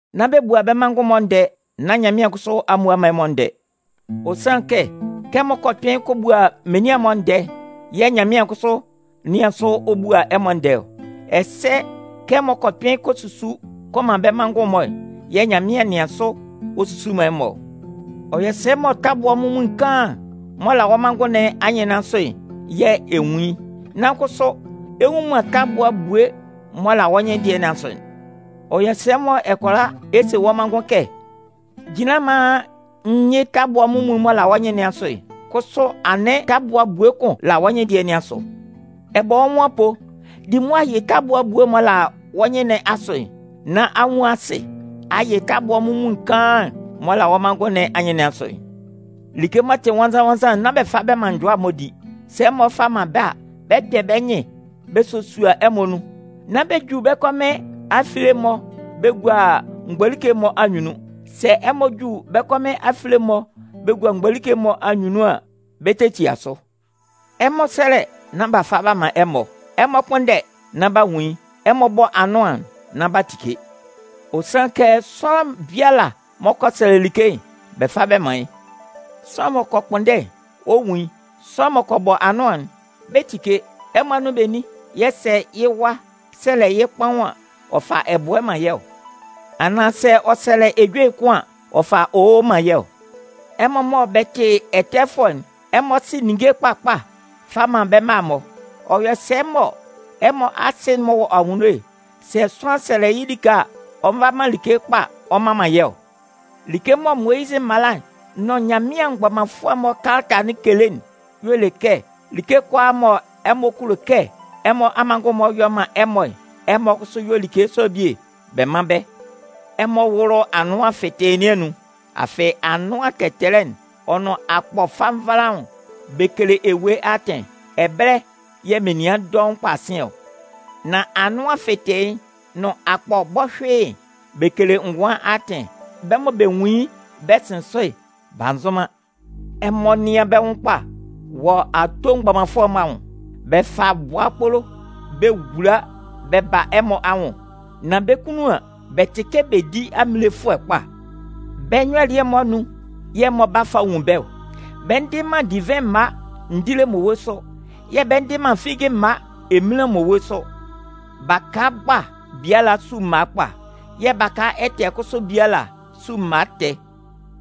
“Nán bɛ bua bɛ́ manngʋn'n-mɔ ndɛɛ nán Nyanmɩan kʋsʋ a mmua man ɛmɔ ndɛɛ. Ɔ sanlɩn kɛ, kɛ ɛmɔ kɔ kpɩn kɔ bua menian'n-mɔ ndɛɛ'n yɛ̂ Nyanmɩan kʋsʋ 'nɩan sʋ ɔ bua ɛmɔ ndɛɛ ɔ. Ɛsɛ kɛ ɛmɔ kɔ kpɩn kɔ susu kɔ man bɛ́ manngʋn'n-mɔ'n yɛ̂ Nyanmɩan 'nɩan sʋ ɔ susu man ɛmɔ ɔ. “Ɔ yɔ sɛ mɔ tabua munmuin kaan'n m'ɔ la wɔ́ manngʋn nɩn anyɩn nɩn asʋ'n yɛ̂ ɛ nwun yɩ́, nan kʋsʋ ɛ nnwun man tabua ebue'n m'ɔ la wɔ́ nyɩn dɩɛ nɩn asʋ'n? Ɔ yɔ sɛ mɔ ɛ kʋala ɛ se wɔ́ manngʋn kɛ: ‘Jinlan maan n yɩ́ tabua munmuin'n m'ɔ la wɔ́ nyɩn nɩn asʋ'n’, kʋsʋ anɩn tabua ebue kʋn la wɔ́ nyɩn dɩɛ nɩn asʋ. Ɛ bɔ wɔ́ nwʋn apoo, di mʋa yɩ tabua ebue'n m'ɔ la wɔ́ nyɩn nɩn asʋ'n, nán a nwun asɩ a yɩ tabua munmuin kaan'n m'ɔ la wɔ́ manngʋn nɩn anyɩn nɩn asʋ'n. “Like m'ɔ tɩ nwannzan-nwannzan'n, nán bɛ fa bɛ man njʋa'n-mɔ di. Sɛ ɛmɔ fa man bɛ́ a, bɛ 'kpɛ bɛ́ nyɩn bɛ sosua ɛmɔ nun. Nán bɛ ju bɛ́ kɔmɩn afile'n-mɔ bɛ gua mgbolike'n-mɔ anyunnun. Sɛ ɛmɔ ju bɛ́ kɔmɩn afile'n-mɔ bɛ gua mgbolike'n-mɔ anyunnun an, bɛ 'tetia sʋ. “Ɛmɔ sɛ́lɛ nán b'a fa b'a man ɛmɔ. Ɛmɔ kpʋ́nndɛ nán b'a nwun yɩ́. Ɛmɔ bɔ́ anʋan'n nán b'a tike. Ɔ sanlɩn kɛ sʋanlan biala m'ɔ kɔ sɛlɛ like'n, bɛ 'fa bɛ man yɩ́. Sʋanlan m'ɔ kɔ kpʋnndɛ'n, ɔ 'nwun yɩ́. Sʋanlan m'ɔ kɔ bɔ anʋan'n, bɛ 'tike. Ɛmɔ anun benin yɛ̂ sɛ yɩ́ wa sɛlɛ yɩ́ kpaʋn an, ɔ fa ɛbʋɛ man yɩ́ ɔ? Anaan sɛ ɔ sɛlɛ yɩ́ ejue kʋn an, ɔ fa owo man yɩ́ ɔ? Ɛmɔ mɔ bɛ tɩ ɛtɛfʋɛ'n, ɛmɔ sɩ ninnge mgbakpa fa man bɛ́ mma'n-mɔ. Ɔ yɔ sɛ mɔ ɛmɔ Asɩ'n m'ɔ wɔ anwunno'n, sɛ sʋanlan sɛlɛ yɩ́ like a, ɔ nva man like kpa ɔ mman man yɩ́ ɔ? “Like mɔ Moyizɩ mala'n nʋn Nyanmɩan mgbɔmanfʋɛ'n-mɔ kalata'n kele'n y'ɔ le kɛ: Like kʋalaa mɔ ɛmɔ kulo kɛ ɛmɔ amanngʋn'n-mɔ yɔ́ mán ɛmɔ'n, ɛmɔ kʋsʋ yɔ́ like sɔ'n bie mán bɛ́. “Ɛmɔ wʋ́lʋ anʋan fɩtɩɩ nɩn anun. Afɩ anʋan tɛtɛlɛ'n ɔ nʋn akpɔ fanvalaʋn'n, bɛ kele ewue atɩn. Ɛbɛlɛ yɛ̂ menian dɔʋn kpa sɩn ɔ. Nan anʋan fɩtɩɩ'n nʋn akpɔ bɔhyʋɩ'n, bɛ kele ngʋan atɩn. Bɛ́ mɔ bɛ nwun yɩ́ bɛ sɩn sʋ'n, b'a nzʋn man. “Ɛmɔ nɩ́an bɛ́ nwʋn kpa wɔ ato mgbɔmanfʋɛ'n-mɔ anwʋn. Bɛ fa bʋa kpolo bɛ wula bɛ ba ɛmɔ anwʋn. Nan bɛ́ kunnun an, bɛ tɩ kɛ bedi aminlefʋɛ kpa. Bɛ́ nyɔlɩɛ'n-mɔ anun yɛ̂ ɛmɔ 'ba fa nwun bɛ́ ɔ. Bɛ ndɩ man divɩn mma ndile mmowe sʋ, yɛ̂ bɛ ndɩ man figi mma eminlan mmowe sʋ. Baka kpa biala su mma kpa. Yɛ̂ baka ɛtɛ kʋsʋ biala su mma ɛtɛ.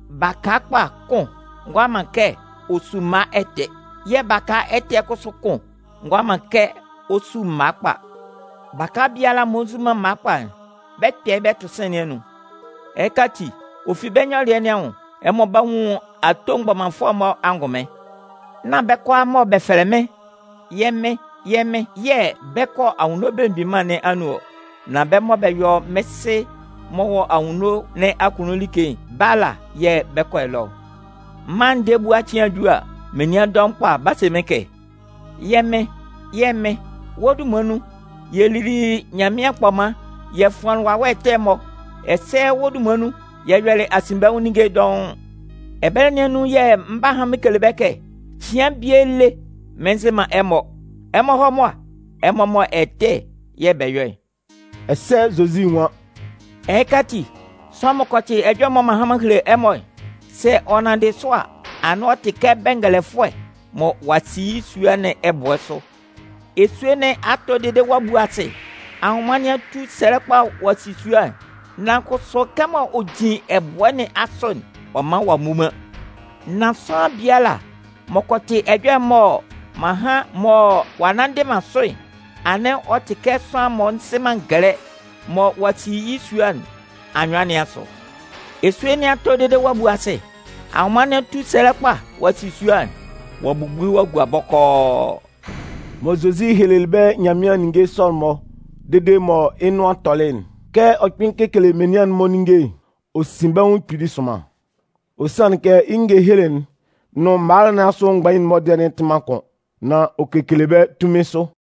Baka kpa kʋn ngʋala man kɛ ɔ su mma ɛtɛ. Yɛ̂ baka ɛtɛ kʋsʋ kʋn ngʋala man kɛ ɔ su mma kpa. Baka biala m'ɔ nzu man mma kpa'n, bɛ 'kpɛ bɛ tʋ sɩ̂n nɩn anun. Ɛhɩka ati, ɔ fi bɛ́ nyɔlɩɛ nɩn anwʋn, ɛmɔ 'ba nwun ato mgbɔmanfʋɛ'n-mɔ angʋnmɩn. “Nán bɛ́ kʋalaa mɔ bɛ fɛlɛ mɩ́n: ‘Yɛ́ Mɩn, yɛ́ Mɩn’ yɛ̂ bɛ 'kɔ Anwunno Belemgbin Mân nɩn anun ɔ. Nan bɛ́ mɔ bɛ yɔ mɩ́n Sɩ m'ɔ wɔ anwunno nɩn akunnun like'n, bɛ́ ala yɛ̂ bɛ 'kɔ ɛlɔ ɔ. Mân'n ndɛɛ ebua cɩan'n ju a, menian dɔʋn kpa 'ba se mɩ́n kɛ: ‘Yɛ́ Mɩn, yɛ́ Mɩn, wɔ́ dunman nun, yɛ lili Nyanmɩan kpɔman, yɛ fʋanlɩn wawɛ ɛtɛ'n-mɔ. Ɛsɛ wɔ́ dunman nun, yɛ yɔlɩ asinbɛnwʋn ninnge dɔʋn!’ Ɛbɛlɛ nɩn anun yɛ̂ mɩn 'ba han mɩn kele bɛ́ kɛ: Cɩan bie lé mɩn nzɩ man ɛmɔ. Ɛmɔ hɔ́ mʋa, ɛmɔ mɔ ɛtɛ yɛ̂ bɛ yɔ'n.” Ɛsɛ Zozi nwan: “Ɛhɩka ati, sʋanlan m'ɔ kɔ tɩ ɛjɔlɛ'n mɔ m'an han m'an hele ɛmɔ'n, sɛ ɔ nanndɩ sʋ a, anɩn ɔ tɩ kɛ bɛngɛlɛfʋɛ mɔ ɔ'a si yɩ́ sua nɩn ɛbʋɛ sʋ. Esue nɩn a tɔ dede ɔ'a bu asɩ, anwʋnman nɩn a tu sɛlɛ kpa a si sua'n, nan kʋsʋ kɛmɔ ɔ jin ɛbʋɛ nɩn asʋ'n, ɔ man ɔ'a mmu man. Nan sʋanlan biala m'ɔ kɔ tɩ ɛjɔlɛ'n mɔ m'an han mɔ ɔ'a nnanndɩ man sʋ'n, anɩn ɔ tɩ kɛ sʋanlan m'ɔ nzɩ man ngɛlɛ, mɔ ɔ'a si yɩ́ sua nɩn anyʋan nɩn asʋ. Esue nɩn a tɔ dede ɔ'a bu asɩ, anwʋnman nɩn a tu sɛlɛ kpa a si sua sɔ'n. Ɔ'a bubu ɔ'a gua bɔkɔɔ.” Mɔ Zozi hehelelɩ bɛ́ Nyanmɩan ninnge sɔ'n-mɔ dede mɔ yɩ́ nʋan tɔlɩ'n, kɛ ɔ kpɩn kekele menian'n-mɔ ninnge'n, ɔ sin bɛ́ nwʋn kpili sʋnman. Ɔ sanlɩn kɛ yɩ́ ngehele'n nʋn mala nɩn asʋ mgbain'n-mɔ dɩɛ'n tɩ man kʋn. Nan ɔ kekele bɛ́ tunmin sʋ.